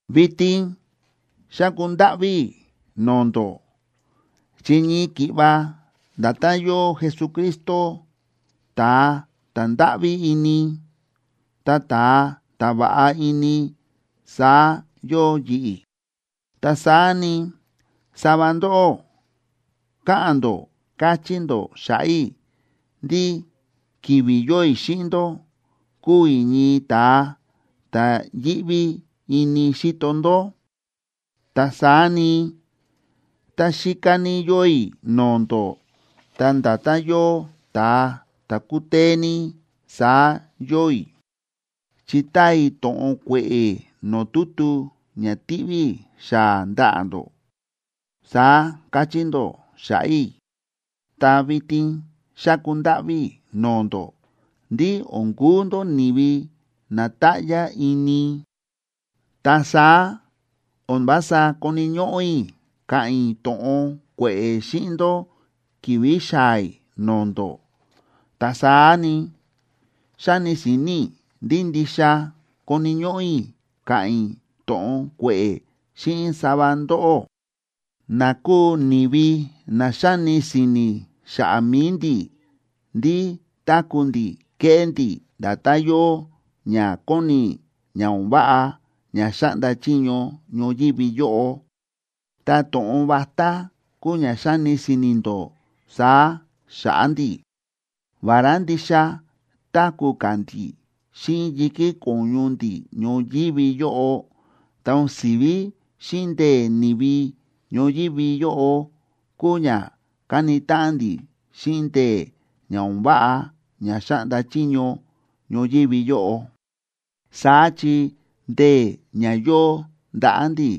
Vitin xáku ndáꞌví i̱ no̱o̱ ndó, chi ñii ki̱ꞌva nda̱tán yóo Jesucristo ta̱a ta̱ ndáꞌví ini, ta ta̱a ta̱ va̱ꞌa ini saá yóo yi̱ꞌi̱. Ta saá ni, sava ndóꞌó káꞌa̱n ndó káchí ndó xa̱ꞌa̱ i̱ ndí ki̱vi̱ yóo i̱ xíꞌin ndó, kúu i̱ ñii ta̱a ta̱ yíꞌví ini xíto ndó, ta saá ni, tá xíká ní yóo i̱ no̱o̱ ndó, ta nda̱tán yóo ta̱a ta̱ kútee ní, saá yóo i̱, chi táa i̱ to̱ꞌon kue̱ꞌe̱ no̱o̱ tutu ña tíꞌví i̱ xaa̱ ndaꞌa̱ ndó, saá káchí ndó xa̱ꞌa̱ i̱. Ta vitin xáku ndáꞌví i̱ no̱o̱ ndó ndí o̱n kuu ndó ni̱vi na táꞌyá ini. Ta saá o̱n vása koni̱ ñóꞌó i̱ ka̱ꞌa̱n i̱ to̱ꞌon kue̱ꞌe̱ xíꞌin ndó ki̱vi̱ xaa̱ i̱ no̱o̱ ndó. Ta saá ni, xáni si̱ni̱ i̱ ndí ndixa koni̱ ñóꞌó i̱ ka̱ꞌa̱n i̱ to̱ꞌon kue̱ꞌe̱ xíꞌin sava ndóꞌó, na kúu ni̱vi na xáni si̱ni̱ xa̱ꞌa̱ mi̱i ndi̱ ndí táku̱ ndi̱ kéꞌé ndi̱ nda̱tán yóo ña kóni ña o̱n váꞌa ña xáꞌnda chiño ñoyívi yóꞌo. Ta to̱ꞌon vatá kúu ña xáni si̱ni̱ ndó saá xa̱ꞌa̱ ndi̱. Vará ndixa táku̱ ka̱ ndi̱ xíꞌin yi̱kí ko̱ñu ndi̱ ñoyívi yóꞌo, ta o̱n si̱ví xíꞌin ndee̱ ni̱vi ñoyívi yóꞌo kúu ña káni táꞌan ndi̱ xíꞌin ndee̱ ña o̱n váꞌa ña xáꞌnda chiño ñoyívi yóꞌo. Saá chi ndee̱ ña yóo ndaꞌa̱ ndi̱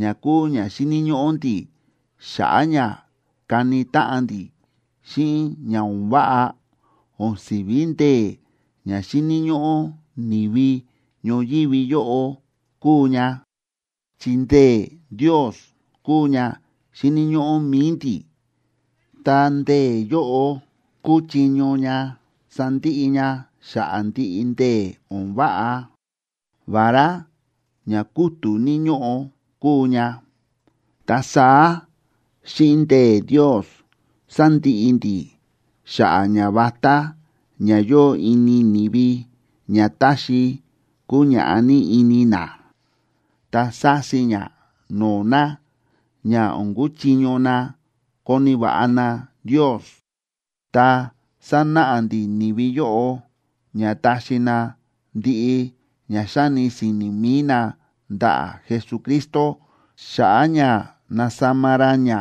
ña kúu ña xíni̱ ñóꞌó ndi̱ xa̱ꞌa̱ ña kani táꞌan ndi̱ xíꞌin ña o̱n váꞌa, o̱n si̱ví ndee̱ ña xíni̱ ñóꞌó ni̱vi ñoyívi yóꞌo kúu ña. Chi ndee̱ Ndios kúu ña xíni̱ ñóꞌó mi̱i ndi̱, ta ndee̱ yóꞌo kúchiño ña sandiꞌi ña xa̱ꞌa̱ ndiꞌi ndee̱ o̱n váꞌa, vará ña kútu̱ ní ñóꞌo kúu ña. Ta saá xíꞌin ndee̱ Ndios sándiꞌi ndi̱ xa̱ꞌa̱ ñavatá ña yóo ini ni̱vi ña táxi kuñaꞌá ní ini na, ta sási ña no̱o̱ na ña o̱n kuchiño na koni̱ va̱ꞌa na Ndios. Ta sánáꞌa ndi̱ ni̱vi yóꞌo ña taxi na ndiꞌi ña xáni si̱ni̱ mi̱i na ndaꞌa̱ Jesucristo, xa̱ꞌa̱ ña nasama ra ña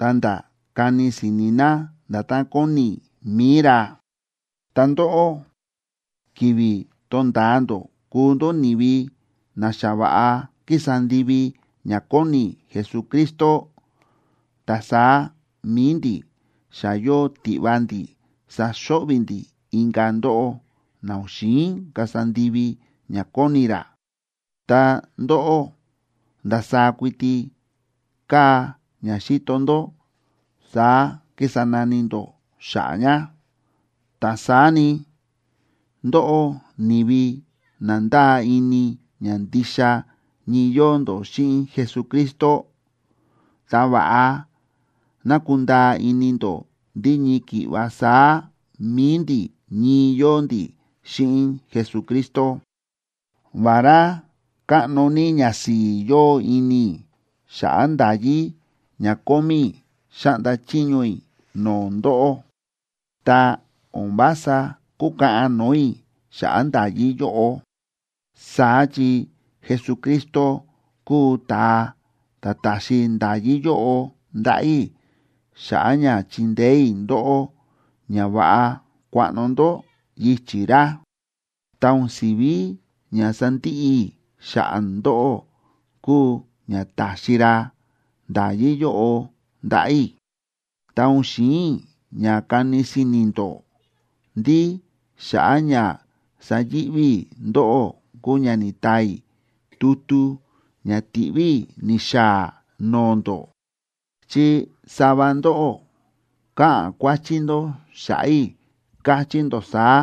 ta̱nda̱ kani si̱ni̱ na nda̱tán kóni mi̱i ra. Ta ndóꞌó, ki̱vi̱ tonda̱a ndó kuu ndó ni̱vi na xa va̱ꞌa kísa ndivi ña kóni Jesucristo, ta saá mi̱i ndi̱ xa yóo tiꞌva ndi̱ saxo̱ꞌvi̱ ndi̱ inka̱ ndóꞌó na o̱n xi̱in kasa ndivi ña kóni ra. Ta ndóꞌó, ndasaá kuiti káa ña xíto ndó, saá kísa nani ndó xa̱ꞌa̱ ña. Ta saá ni, ndóꞌó ni̱vi na ndáa ini ña ndixa ñii yóo ndó xíꞌin Jesucristo, ta va̱ꞌa ná kunda̱a̱ ini ndó ndí ñii ki̱ꞌva saá mi̱i ndi̱ ñii yóo ndi̱ xíꞌin Jesucristo. Vará káꞌno ní ñasi̱i̱ yóo ini i̱ xa̱ꞌa̱ nda̱yí ña kómí i̱ xáꞌnda chiño i̱ no̱o̱ ndóꞌó, ta o̱n vása kúkaꞌan no̱o̱ i̱ xa̱ꞌa̱ nda̱yí yóꞌo. Saá chi Jesucristo kúu ta̱a ta̱ ta̱xi nda̱yí yóꞌo ndaꞌa̱ i̱ xa̱ꞌa̱ ña chindeé i̱ ndóꞌó ña va̱ꞌa kuaꞌno ndó yichi̱ ra, ta o̱n si̱ví ña sandiꞌi i̱ xa̱ꞌa̱ ndóꞌó kúu ña ta̱xi ra nda̱yí yóꞌo ndaꞌa̱ i̱. Ta o̱n xi̱in i̱ ña kani si̱ni̱ ndó ndí xa̱ꞌa̱ ña sayi̱ꞌví i̱ ndóꞌó kúu ña ni̱taa i̱ tutu ña ti̱ꞌví i̱ ni̱xaa̱ no̱o̱ ndó. Chi sava ndóꞌó káꞌa̱n kuáchí ndó xa̱ꞌa̱ i̱, káchí ndó saá: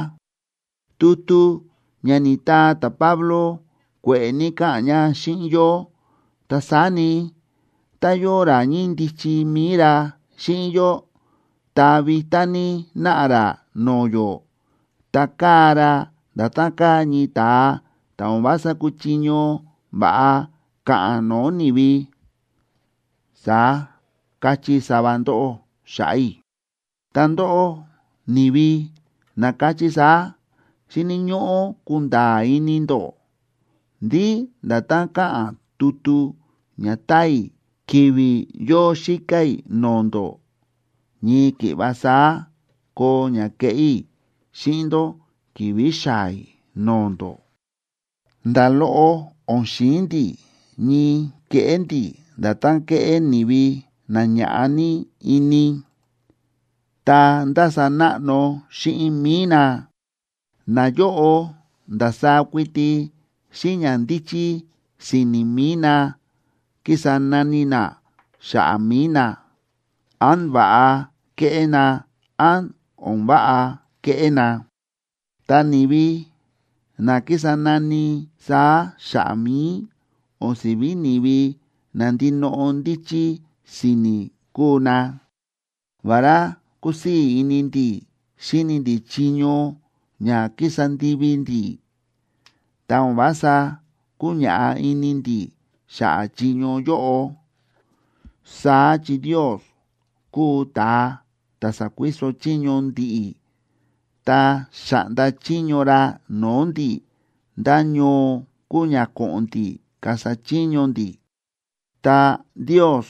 “Tutu ña ni̱taa ta̱Pablo kue̱ꞌe̱ ní káꞌa̱n ña xíꞌin yó, ta saá ni, tá yóo ra ñíndichi mi̱i ra xíꞌin yó, ta vitá ní náꞌa ra no̱o̱ yó, ta káa ra nda̱tán káa ñii ta̱a ta̱ o̱n vása kúchiño va̱ꞌa ka̱ꞌa̱n no̱o̱ ni̱vi”, saá káchí sava ndóꞌó xa̱ꞌa̱ i̱. Ta ndóꞌó, ni̱vi na káchí saá, xíni̱ ñóꞌó kunda̱a̱ ini ndó ndí nda̱tán káꞌa̱n tutu ña táa i̱ ki̱vi̱ yóo xíká i̱ no̱o̱ ndó, ñii ki̱ꞌva saá koo ña keꞌé i̱ xíꞌin ndó ki̱vi̱ xaa̱ i̱ no̱o̱ ndó. Nda̱ loꞌo o̱n xi̱in ndi̱ ñii keꞌé ndi̱ nda̱tán kéꞌé ni̱vi na ña̱ꞌa ní ini ta ndása náꞌno xíꞌin mi̱i na. Nayóꞌo ndasaá kuiti xíꞌin ñandíchí si̱ni̱ mi̱i na kísa nani na xa̱ꞌa̱ mi̱i na, án va̱ꞌa kéꞌé na, án o̱n váꞌa kéꞌé na. Ta ni̱vi na kísa nani saá xa̱ꞌa̱ mi̱i o̱n si̱ví ni̱vi na ndinoꞌo ndíchí si̱ni̱ kúu na. Vará kúsii̱ ini ndi̱ xíni ndi̱ chiño ña ki̱sa ndivi ndi̱, ta o̱n vása kúñaꞌá ini ndi̱ xa̱ꞌa̱ chiño yóꞌo. Saá chi Ndios kúu ta̱a ta̱ sa̱kuiso chiño ndi̱ꞌi̱ ta xa̱ꞌnda chiño ra no̱o̱ ndi̱ ndá ñoo kuu ña ko̱ꞌo̱n ndi̱ kasa chiño ndi̱, ta Ndios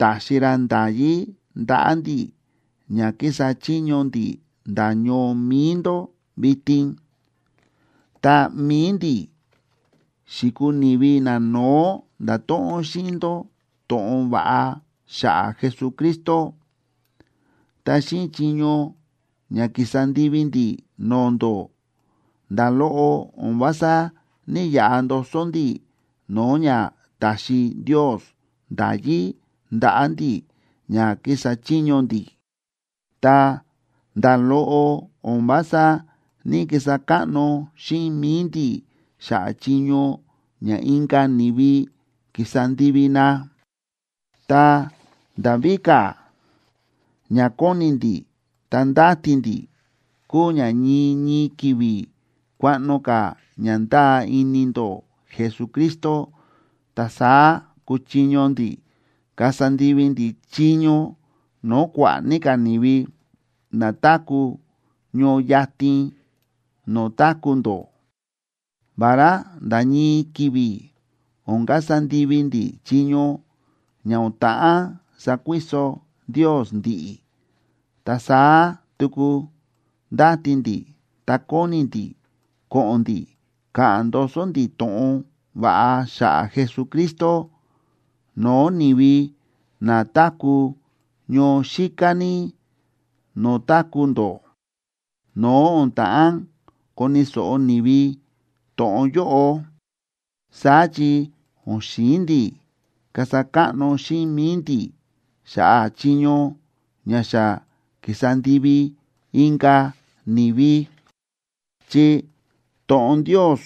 ta̱xi ra nda̱yí ndaꞌa̱ ndi̱ ña kísa chiño ndi̱ nda̱ ñoo mi̱i ndó vitin. Ta mi̱i ndi̱ xi̱kuu ni̱vi nano̱ó nda̱to̱ꞌon xíꞌin ndó to̱ꞌon va̱ꞌa xa̱ꞌa̱ Jesucristo. Ta xíꞌin chiño ña ki̱sa ndivi ndi̱ no̱o̱ ndó, nda̱ loꞌo o̱n vása ní‑yaꞌa ndoso ndi̱ no̱o̱ ña ta̱xi Ndios nda̱yí ndaꞌa̱ ndi̱ ña kísa chiño ndi̱. Ta nda̱ loꞌo o̱n vása ní‑kisa káꞌno xíꞌin mi̱i ndi̱ xa̱ꞌa̱ chiño ña inka̱ ni̱vi ki̱sa ndivi na. Ta nda̱ víka̱, ña kóni ndi̱ ta ndáti ndi̱ kúu ña ñii ñii ki̱vi̱ kuaꞌno ka̱ ña ndáa ini ndó Jesucristo, ta saá kuchiño ndi̱ kasa ndivi ndi̱ chiño no̱o̱ kua̱ꞌa̱ ní ka̱ ni̱vi na táku̱ ñoo yatin no̱o̱ táku̱ ndó, vará nda̱ ñii ki̱vi̱ o̱n kasa ndivi ndi̱ chiño ña o̱n ta̱ꞌán sakuiso Ndios ndi̱ꞌi̱. Ta saá tuku ndáti ndi̱ ta kóni ndi̱ ko̱ꞌo̱n ndi̱ ka̱ꞌa̱n ndoso ndi̱ to̱ꞌon va̱ꞌa xa̱ꞌa̱ Jesucristo no̱o̱ ni̱vi na táku̱ ñoo xíká ní no̱o̱ táku̱ ndó, no̱o̱ o̱n ta̱ꞌán koni̱ so̱ꞌo ni̱vi to̱ꞌon yóꞌo. Saá chi o̱n xi̱in ndi̱ kasa káꞌno xíꞌin mi̱i ndi̱ xa̱ꞌa̱ chiño ña xa ki̱sa ndivi inka̱ ni̱vi. Chi to̱ꞌon Ndios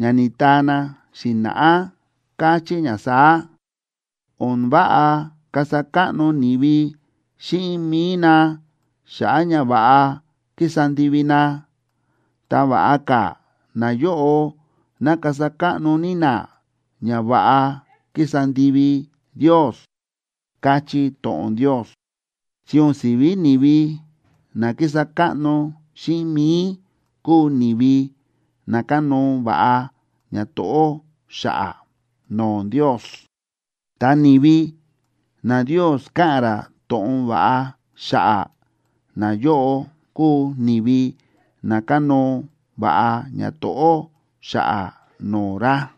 ña ni̱taa na xi̱na̱ꞌá káchí ña saá: “O̱n váꞌa kasa káꞌno ni̱vi xíꞌin mi̱i na xa̱ꞌa̱ ñava̱ꞌa kísa ndivi na, ta va̱ꞌa ka̱ nayóꞌo ná kasa káꞌno ní na ñava̱ꞌa kísa ndivi Ndios”, káchí to̱ꞌon Ndios. Chi o̱n si̱ví ni̱vi na kísa káꞌno xíꞌin mi̱i kúu ni̱vi na kánóo va̱ꞌa ñato̱ꞌó xa̱ꞌa̱ no̱o̱ Ndios, ta ni̱vi na Ndios káꞌa̱n ra to̱ꞌon va̱ꞌa xa̱ꞌa̱, nayóꞌo kúu ni̱vi na kánóo va̱ꞌa ñato̱ꞌó xa̱ꞌa̱ no̱o̱ ra.